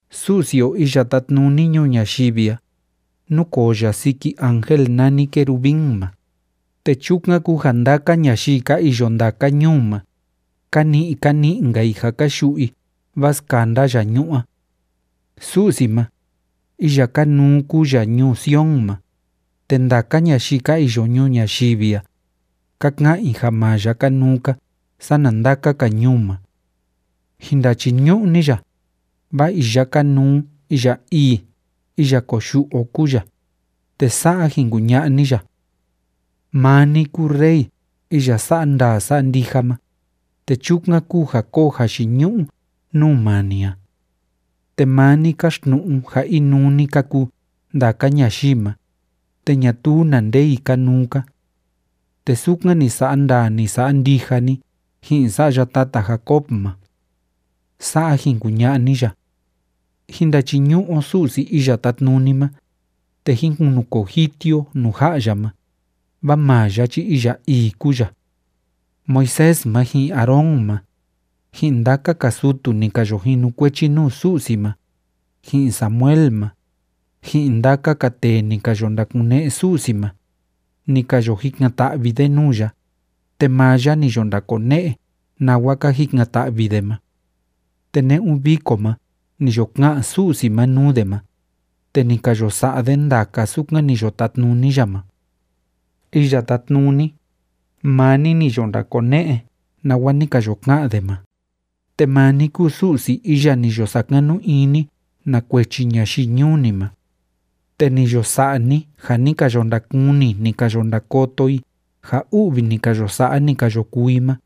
Su'si o iya tátnuni ñuu ñayivi a, núkoo ya siki ángel nani querubín ma, te chukan kúu ja ndaka ñayii ka iyo ndaka ñuu ma, ka ni'i ka ni'i‑nka i ja ka yu'u i vaa skanda ya ñu'ú a. Su'si ma, iya kanuu kúu ya ñuu Sion ma, te ndaka ñayii ka iyo ñuu ñayivi a, ka ka'an i ja maa ya kanuu‑ka sana ndaka‑ka ñuu ma. Jin ndachiñu'u ni ya, vaa iya kanuu iya ii iya koyu'u o kúu ya, te sa'a jin kuña'a ni ya: “Maa ni kúu Rey iya sa'a ndaa sa'a ndija ma, te chukan kúu ja kóo jayiñu'u nuu maa ni a. Te maa ni káxtnu'u ja inuu‑ni ka kuu ndaka ñayii ma, te ñatuu na nde i kanuu‑ka. Te sukan ni sa'a ndaa ni sa'a ndija ni ji'in sa'ya tata Jacob ma.” Sa'a jin kuña'a ni ya. Jín ndachiñu'u o Su'si o Iya Tátnuni ma, te jín kunukoo jiti o nuu ja'a ya ma, vaa maa ya chi iya ii kúu ya. Moisés ma, ji'in Aarón ma, ji'in ndaka‑ka sutu ni ka yo jinukuechi nuu Su'si ma, ji'in Samuel ma, ji'in ndaka‑ka tee ni ka yo ndakune'e Su'si ma, ni ka yo jikan‑ta'vi de nuu ya, te maa ya ni yo ndakone'e nawa ka jikan‑ta'vi de ma. Te ne'un viko ma ni yo ka'an Su'si ma nuu de ma, te ni ka yo sa'a de ndaka sukan ni yo tatnuni ya ma. Iya Tátnuni, maa ni ni yo ndakone'e nawa ni ka yo ka'an de ma, te maa ni kúu Su'si iya ni yo sakanu ini na kuechi ñayii ñuu ni ma, te ni yo sa'a ni ja ni ka yo ndakuni, ni ka yo ndakoto i ja u'vi ni ka yo sa'a, ni ka yo kuu i ma.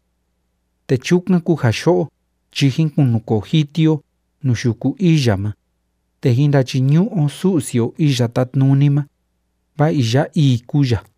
Te chukan kúu ja yo'o chi jín kunukoo jiti o nuu yuku ii ya ma, te jín ndachiñu'u o Su'si o Iya Tátnuni ma, vaa iya ii kúu ya.